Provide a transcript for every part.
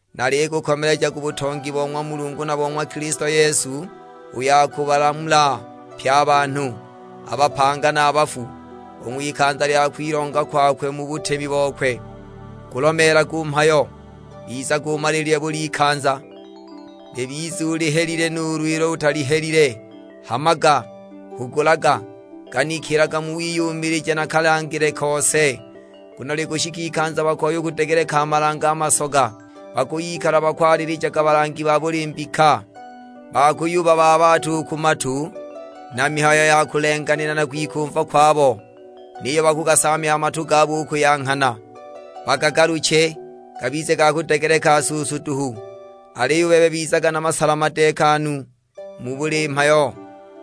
Nalikukomeleja ku butongi bo ng'wa Mulungu na bo ng'wa Kilisto Yesu, uyo akubalamula pye a banhu, a bapanga na a bafu, u ng'wikanza lya kwilonga kwakwe mu butemi bokwe. Gulomeelage u mhayo, bizaga umaliilile buli ikanza: libize ulihelile nuulu ilo utalihelile; hamaga, hugulaga, ganikilaga mu wiyumilija na kalangile kose. Nguno likushika ikanza bakoya u kudegeleka a malange a masoga, bakuyikala bakwalilijaga balangi ba buli mbika, ba kuyubabaabaata u ku matu na mihayo ya kulenganila na kwikumva kwabo! Niyo bakugasaamya a matu gabo u ku ya nghana, bagagaluche gabize ga kudegelekela suusu duhu! Aliyo u bebe bizaga na masala madeekanu mu buli mhayo;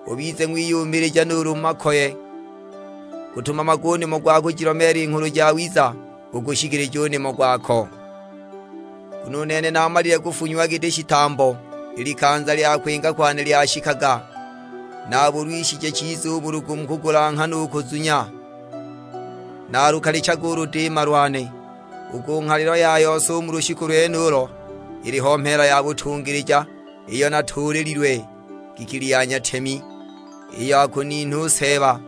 ubize ng'wiyumilija nuulu mu makoye; gutumamage u nimo gwa kujilomeela i Nghulu Jawiza, ugushikilije u nimo gwako. Nguno u nene naamalile kufunyiwa giti shitambo, i likanza lya kwinga kwane lyashikaga. Naabulwishije chiza u bulugu mu kugulanghana u kuzunya, naalukalichaga u ludiima lwane. U ku nghalilo ya yose u mu lushiku lwenulo, iliho mheela ya butungilija, iyo natuulililwe; ngikili ya nyatemi, iyo akuninha u Seeba,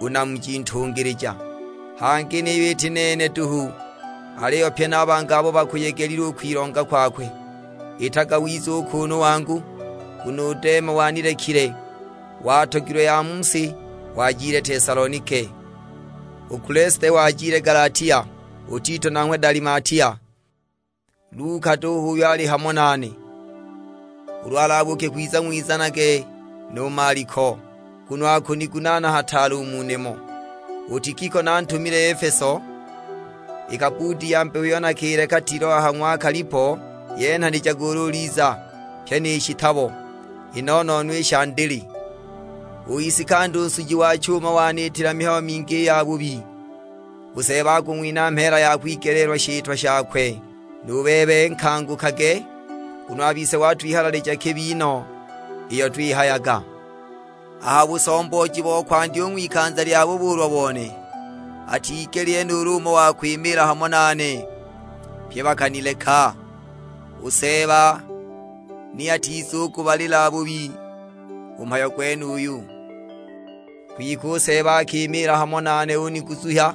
u Namuji ntungilija. Hangi niyo iti nene duhu, aliyo pye na a bangi abo bakuyegelile u kwilonga kwakwe. Itaga wize u kuunu wangu, nguno u Dema wanilekile, watogilwe ya mu si, wajile Tesalonike. U Kulesite wajile Galatia, u Tito nanghwe Dalimatia. Luka duhu h'uyo ali hamo nane. Ulu ulabuuke kwiza ng'wizanage nu Maliko, nguno akunigunaana hataale u mu nimo. U Tikiko nantumile Efeso. I kabbuudi ya mbeho iyo nakileka Tiloa ha ng'wa Kalipo yenhanijage ulu uliza, pyi ni shitabo, i no-no-no i sha ndili. U Isikanda u nsuji wa chuma waniitila mihayo mingi i yabubi, u Seeba akung'winha mheela ya kwigeleelwa shitwa shakwe. Nu bebe nkangukage, nguno a bise watwihalalijaga kibi no iyo twihayaga! A ha busombooji wa kwandya u ng'wikanza lya bubuulwa bone, atigelile nuulu umo wa kwimiila hamo nane, pye bakanileka; u Seeba ni atizagubabalila bubi u mu mhayo gwenuyo. Kwike u Seeba akimiila hamo nane uniguzuhya,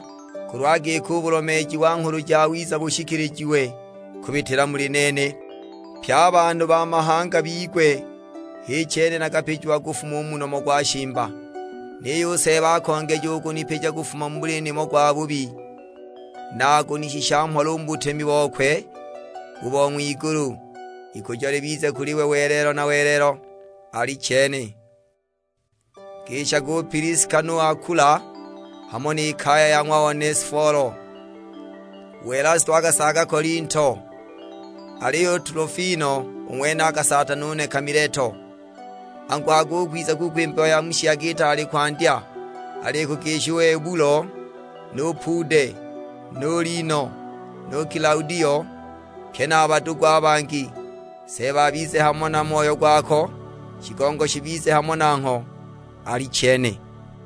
kulwa giki u bulomeeji wa Nghulu Jawiza bushikilijiwe kubitila muli nene, pye a banhu ba mahanga bigwe, h'i chene nakapijiwa kufuma u mu nomo gwa shimba. Niyo u Seeba akongeja u kunipija kufuma mu buli nimo gwabubi, na akunishisha mhola u mu butemi bokwe u bo ng'wigulu. Ikujo libize kuli we welelo na welelo: Alichene. Ngishage u Piliska nu Akula, hamo ni kaya ya ng'wa Onesifolo. U Elasto akasaaga Kolinto, aliyo u Tulofimo u ng'wene akasaata nuneka Mileto. Anguhaga u kwiza kuko i mbeho ya mu shiyaga itaali kwandya. Alikugisha u Ebulo nu Pude, nu Lino, nu Kilaudio, pye na a badugu a bangi. Seeba abize hamo na moyo gwako. Shigongo shibize hamo nangho: Alichene.